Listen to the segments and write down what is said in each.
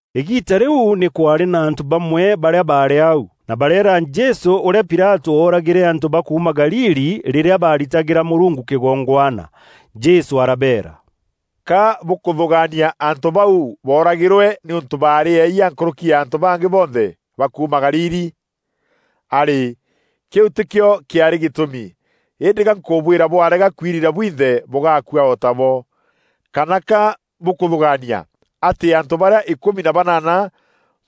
Îgiita rîu nî kwaarî na antû bamwe barîa baarî au, na bareera Jesû ûrîa Pilatû ooragîre antû ba kuuma Galili rîrîa baaritagîra Mûrungu kîgongwana. Jesû arabeera, “Ka bûkûthûgaania antû bau booragîrwe nîûntû baarî eeyia nkûrûki ya antû bangî bonthe ba kuuma Galili? Arî, kîu tîkîo kîaarî gîtûmi! Îndî ga nkûbwîra bwarega kwirira bwinthe bûgakua o tabo. Kana ka bûkûthûgaania atî antû barîa îkûmi na banaana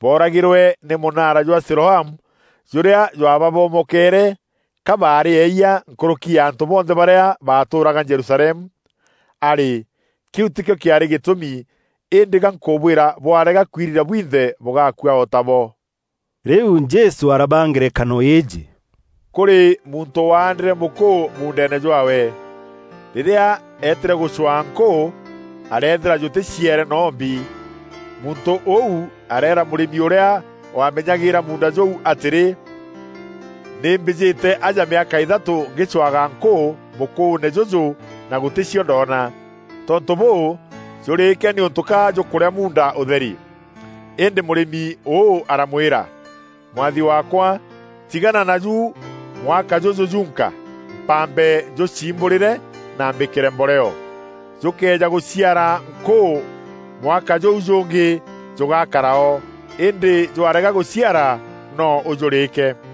booragîrîrwe nî mûnaara jwa Siloamu, jûrîa jwaabamomokere, ka baarî eeyia nkûrûki ya antû bonthe barîa baatûûraga Jerusalemu? Arî, kîu tîkîo kîaarî gîtûmi! Îndî ga nkûbwîra bwarega kwirira bwinthe bûgakua o tabo.” Rîu Jesû arabaa ngerekano îîjî, “Kûrî muntû waandîre mûkûû muundeene jwaawe. Rîrîa eetîre gûcwaa nkûû, areethîra jûtîciere noo mbi. Muntû ûu areera mûrîmi ûrîa waamenyagîîra muunda jûu atîrî, ‘Nî mbîjete aja mîaka îthatû ngîcwaga nkûû mûkûûne jûjû na gûtî cio ndoona. Tontû bûû, jûrîîke nîûntû ka jûkûrîa muunda ûtheri.’ Îndî mûrîmi ûû aramwîra, ‘Mwathi waakwa, tigana naju mwaka jûjû jûnka, mpambe njûciimbûrîre na mbîkîre mboreo. Jûkëeja gûciara nkûû mwaka jûu jûngî, jûgakara o, îndî jwarega gûciara noo ûjûrîîke.’”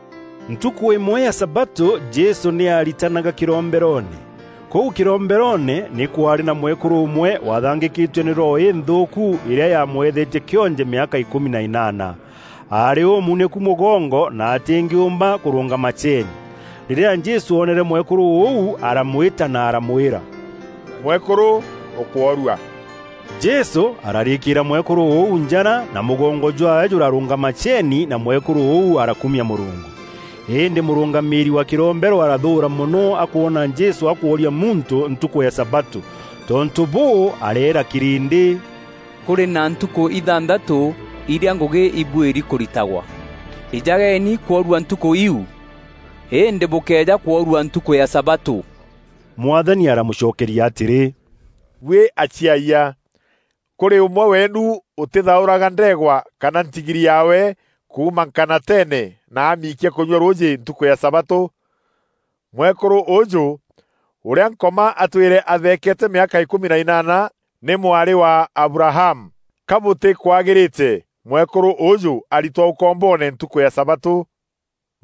Ntukû îmwe ya sabatû Jesû nî aaritanaga kîromberoone. Kûu kîromberoone nî kwaarî na mwekûrû ûmwe waathangîkîtue nî roho înthûûku îrîa yaamwethetie kîonje mîaka îkûmi na înaana. Aarî ûmunîku mûgongo na atîngîûmba kûrûngama ceeni. Rîrîa Jesû oonere mwekûrû ûu, aramwîta na aramwîra, “Mwekûrû, ûkworua.” Jesû ararîkîîra mwekûrû ûu njara, na mûgongo jwaawe jûrarûngama ceeni na mwekûrû ûu arakumia Mûrungu. Îndî mûrûngamîîri wa kîrombero arathûûra mono akwona Jesû akworia muntû ntukû ya sabatû. Tontû bûû, areera kîrîndî, “Kûrî na ntukû ithanthatû irîa ngûgî îbuîri kûritagwa. Îjageni kworua ntukû iu, îndî bûkeeja kworua ntukû ya sabatû.” Mwathani aramûcokeria atîrî, “Buî aciayia! Kûrî ûmwe weenu ûtîthaûraga ndeegwa kana ntigiri yaawe kuuma nkanateene na amiikia kûnyua rûûjî ntukû ya sabatû? Mwekûrû ûûjû, ûrîa Nkoma atwîre atheekeete mîaka îkûmi na înaana nî mwarî wa Abrahamu. Ka bûtîkwagîrîte mwekûrû ûûjû aritwa ûkomboone ntukû ya sabatû?”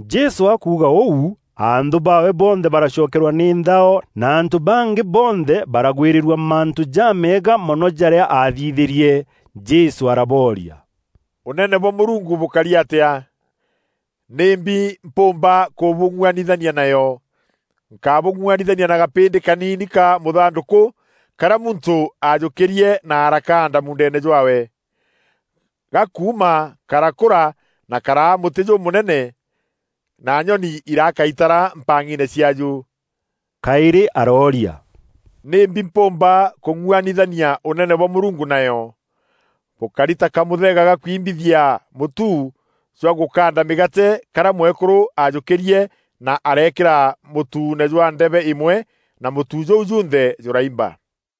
Jesû akuuga ûu anthû baawe bonthe baracokerwa nî nthao na antû bangî bonthe baragwîrîrua mantû jameega mono jarîa aathithîrie. Jesû arabooria, “Ûnene bwa Mûrungu bûkari atîa? Nîmbi mpûûmba kûbûng'uanithania nayo? Nkabûng'ûanithania na gapîndî kaniini ka mûthandûkû karîa muntû ajûkîrie na arakaanda muundeene jwaawe. Gakuuma karakûra na karaa mûtî jûmûnene na nyoni iraaka itara mpang'iine ciaaju.” Kaîrî arooria, “Nîmbi mpûûmba kûng'uanithania Ûnene bwa Mûrungu nayo? Bûkari ta kamûthega ga kwimbithia mûtu jwa gûkaanda mîgaate karîa mwekûrû ajûkîrie na areekîra mûtuune jwa ndebe îmwe na mûtu jûu junthe jûraimba.”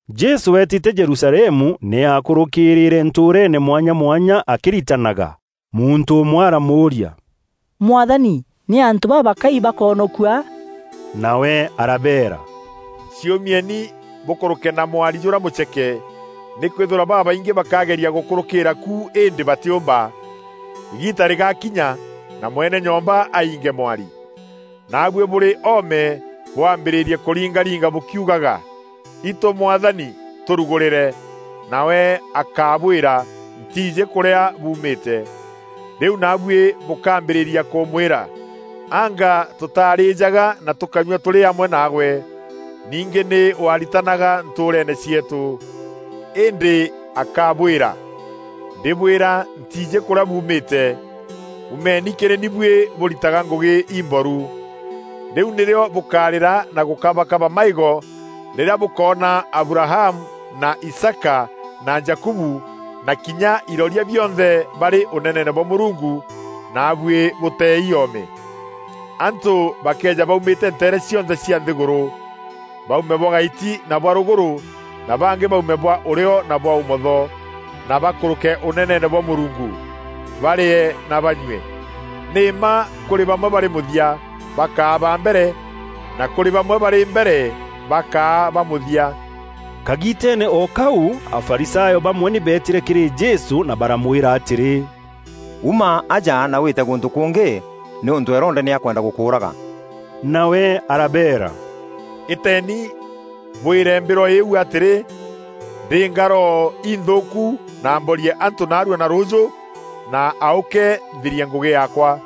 Jesû eetîte Jerusalemu nî aakûrûkîrîîre ntûûreene mwanya mwanya akîritanaga. Muntû ûmwe aramûûria, “Mwathani, nî antû babakai bakoonokua?” Nawe arabeera, “Ciûmieni bûkûrûke na mwari jûrîa mûceke, nîkwîthîrwa babaingî bakageria gûkûrûkîîra ku îndî batîûmba. Îgiita rîgakinya na mwene nyomba ainge mwari. Naabuî bûrî oome, bwambîrîrie kûringaringa bûkiugaga, ‘Itû Mwathani, tûrûgûrîre.’ Nawe akabwîra, ‘Ntiijî kûrîa buumîte.’ Rîu naabuî bûkaambîrîria kûmwîra, ‘Anga tûtarijaga na tûkanyua tûrî amwe naagwe; ningî nî waaritanaga ntûûreene cieetû.’ Îndî akabwîra, ‘Ndîbwîra ntiijî kûrîa buumîte! Umeeni kîrî ni buî bûritaga ngûgî imboru!’ Rîu nîrîo bûkarîra na gûkabakaba maîgo rîrîa bûkoona Abrahamu na Isaaka na Jakubu na kinya iroria bionthe barî Ûneneene bwa Mûrungu, naabuî bûteei oome. Antû bakeeja baumîte nteere cionthe cia nthîgûrû: baume bwa gaiti na bwa rûgûrû na bangî baume bwa ûrîo na bwa ûmotho, na bakûrûke Ûneneene bwa Mûrungu, barîe na banyue. Nî mma kûrî bamwe barî mûthia, bakaa ba mbere na kûrî bamwe barî mbere, bakaa ba mûthia.” Kagiiteene o kau Afarisayo bamwe nî beetîre kîrî Jesû na baramwîra atîrî, “Uma aja na wîte gûntû kûngî, nîûntû Herode nî akwenda gûkûûraga.” Nawe arabeera, “Îteeni bwîre mbîrwa îîu atîrî, ‘Ndîînga roho inthûûku na mborie antû naarua na rûûjû na aûke nthirie ngûgî yaakwa.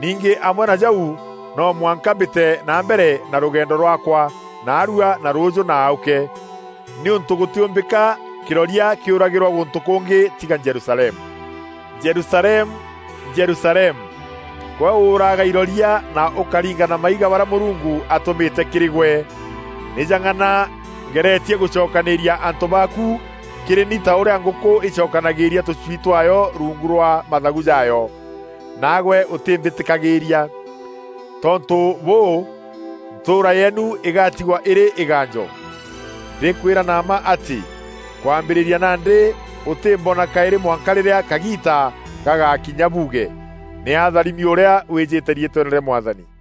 Ningî amwe na jau no mwanka mbîte na mbere na rûgendo rwaakwa naarua na rûûjû na aûke, nîûntû gûtîûmbîka kîroria kîûragîrua gûntû kûngî tiga Jerusalemu.’ Jerusalemu, Jerusalemu! Gwe ûûraaga iroria na ûkaringa na maiga barîa Mûrungu atûmîte kîrî gwe! Nî jang'ana ngeretie gûcokanîîria antû baaku kîrî ni ta ûrîa ngûkû îcokanagîîria tûcwii twaayo ruungu rwa mathagu jaayo, naagwe ûtîmbîtîkagîîria. Tontû bûû, ntûûra yeenu îgatigwa îrî îgaanjo. Ndîkwîra na mma atî, kwambîrîria nandî ûtîmboona kaîrî mwanka rîrîa kagiita gagakinya buuge, ‘Nî atharimi ûrîa wîjîte riîtweene rîa Mwathani.’”